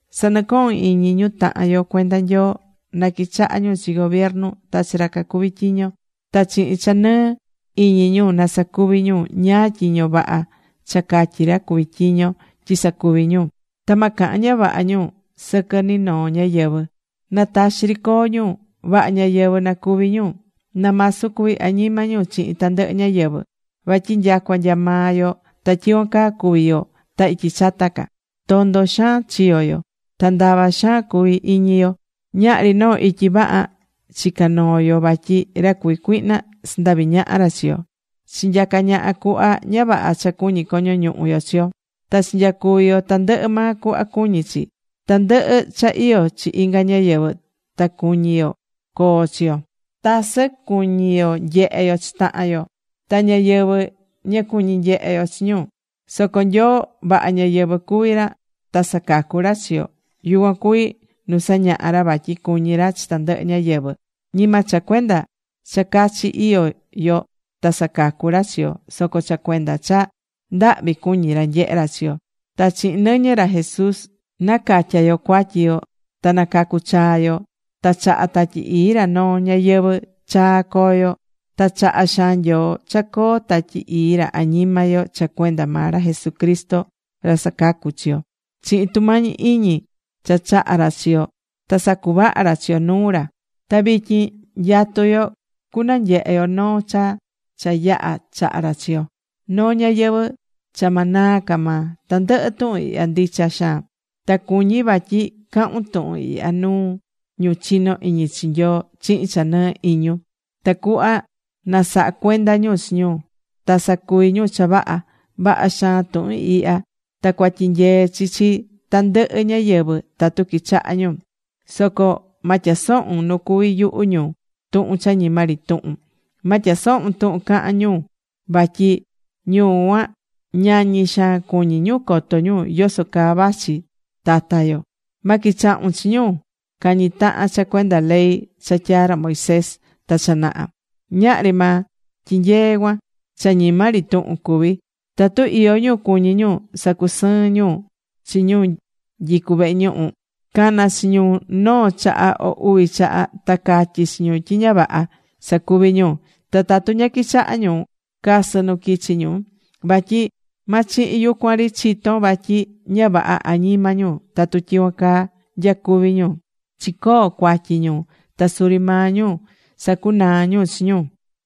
Sa̱nɨcohun iñi ñu tahan yo cuenda Nyoo na quichaha ñu chi gobiernu ta chi ra cacuví tyiño. Ta chihin cha nɨɨ iñi ñu na sacuvi ñu ñáá tyiño vaha cha catyí ra cuví tyiño tyi sacuvi ñu. Ta ma cahan ña vaha ñu sɨquɨ ni noo ñáyɨvɨ. Na taxi ri coo ñu. Vaha ñáyɨvɨ na cuvi ñu. Na masu cuvi añima ñu chihin tandɨhɨ ñáyɨvɨ. Vatyi nyacua nya maa yo ta tyicuan caa cuvi̱ yo ta ityi chata ca. Tondo xaan chiyo̱ yo. Ta ndava xaan cuvi̱ iñi yo. Ñahri noo ityi vaha chica̱ noo yo vatyi ra cuví cuihna sandahvi̱ ñaha ra chi yo. Chinyaca̱ ñaha cuhva ña vaha cha cuñí coño ñuhu yo chi yo. Ta chinyacuvi̱ yo tandɨhɨ maa cuhva cuñí chi. Tandɨhɨ cha iyó chi inga ñáyɨvɨ ta cuñi̱ yo coo chi yo. Tasɨ cuñi̱ yo nyehe yo chi tahan yo. Ta ñáyɨvɨ ña cuñi̱ nyehe ñu chi yo. Soco Nyoo vaha ñáyɨvɨ cuví ra ta sacacu̱ ra chi yo. Yucuan cuvi nu sañaha̱ ra vatyi cuñí ra chi tandɨhɨ ñáyɨvɨ. Ñima cha cuenda cha cachi iyó yo ta sacacu̱ ra chi yo, soco cha cuenda cha ndahvi cuñí ra nyehe ra chi yo. Ta chihin nɨñɨ ra Jesús nacatya̱ yo cuatyi yo ta nacacu̱ chaa yo, ta chahá Tatyi Ii ra noo ñayɨvɨ̱ chaa coo yo. Ta chaha̱ xaan Nyoo cha coo Tatyi Ii ra añima yo cha cuenda maa ra Jesucristo ra sacacú chi yo. Chihin tumañi iñi cha chaha̱ ra chi yo ta sacuvaha ra chi yo nuu ra. Ta vityin nyatú yo cunanyehe yo noo cha cha yaha chaha̱ ra chi yo, noo ñayɨvɨ̱ cha ma naa ca maa. Tandɨhɨ tuhun ihya ndicha xaan. Ta cuñí vatyi cahun tuhun ihya nuu ñu chinó iñi chi Nyoo chihin cha nɨɨ iñun, tacuhva na saha cuenda ñu chi ñu, ta sacuvi ñu cha vaha. Vaha xaan tuhun ihya, ta cuatyinyee chi chi tandɨhɨ ñáyɨvɨ tatu quichahá ñu. Soco ma tyasohun nu cuví yuhu ñu tuhun cha ñima ri tuhun. Ma tyasohun tuhun cahán ñu vatyi ñu cuan ñañí xaan cuñí ñu coto ñu yoso caa vachi tata yo. Ma quichahun chi ñu cañí tahan cha cuenda ley cha tyaa̱ ra Moisés ta cha naha. Ñahri maa tyinyeé cuan. Cha ñima ri tuhun cuví. Tatu iyó ñu cuñí ñu sacusɨɨn ñu chi ñu nyicú vehe ñuhu, ca̱na chi ñu noo chaha o uvi chaha ta ca̱tyi chi ñu tyi ña vaha sacuví ñu. Ta tatu ña quichahá ñu, ca̱sɨ nu quichi ñu. Vatyi ma chihin yucuan ri chitón vatyi ña vaha añima ñu tatu tyicuan caa nyacuví ñu. Chicoo cuatyi ñu. Ta suri maa ñu sacunaá ñu chi ñu.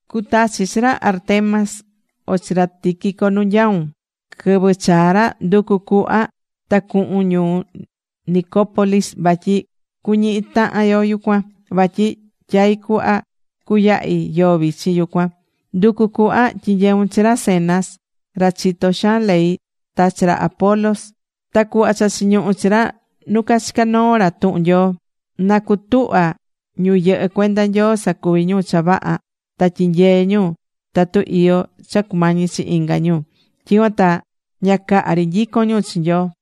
Cutachi chi ra Artemas, o chi ra Tíquico nu nyaún. Quɨvɨ chaa ra, ndu̱cu cuhva ta cu̱hun ñuu Nicópolis vatyi cuñihi tahan yo yucuan. Vatyi tyaí cuhva cuyahi yoo vichin yucuan. Ndu̱cu cuhva tyi̱nyeun chi ra Zenas ra chitó xaan ley, ta chi ra Apolos ta cu̱hva cha chiñuhú chi ra nu cachicá noo ra tuhun Nyoo. Na cutuhva ñu yɨhɨ́ cuenda Nyoo sa̱cuvi ñu cha vaha ta tyi̱nyee ñu tatu iyó cha cumañi chi inga ñu. Tyicuan ta ña caha ri nyicón ñu chi Nyoo.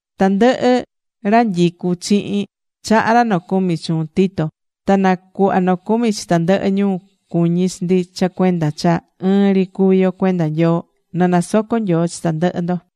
Tandɨhɨ ra nyicu chihin, chahá ra nocumi chuun, Tito. Ta na cuhva nocumi chi tandɨhɨ ñu cuñí chi ndi cha cuenda cha ɨɨn ri cuví yo cuenda Nyoo. Na nasoco Nyoo chi tandɨhɨ ndo.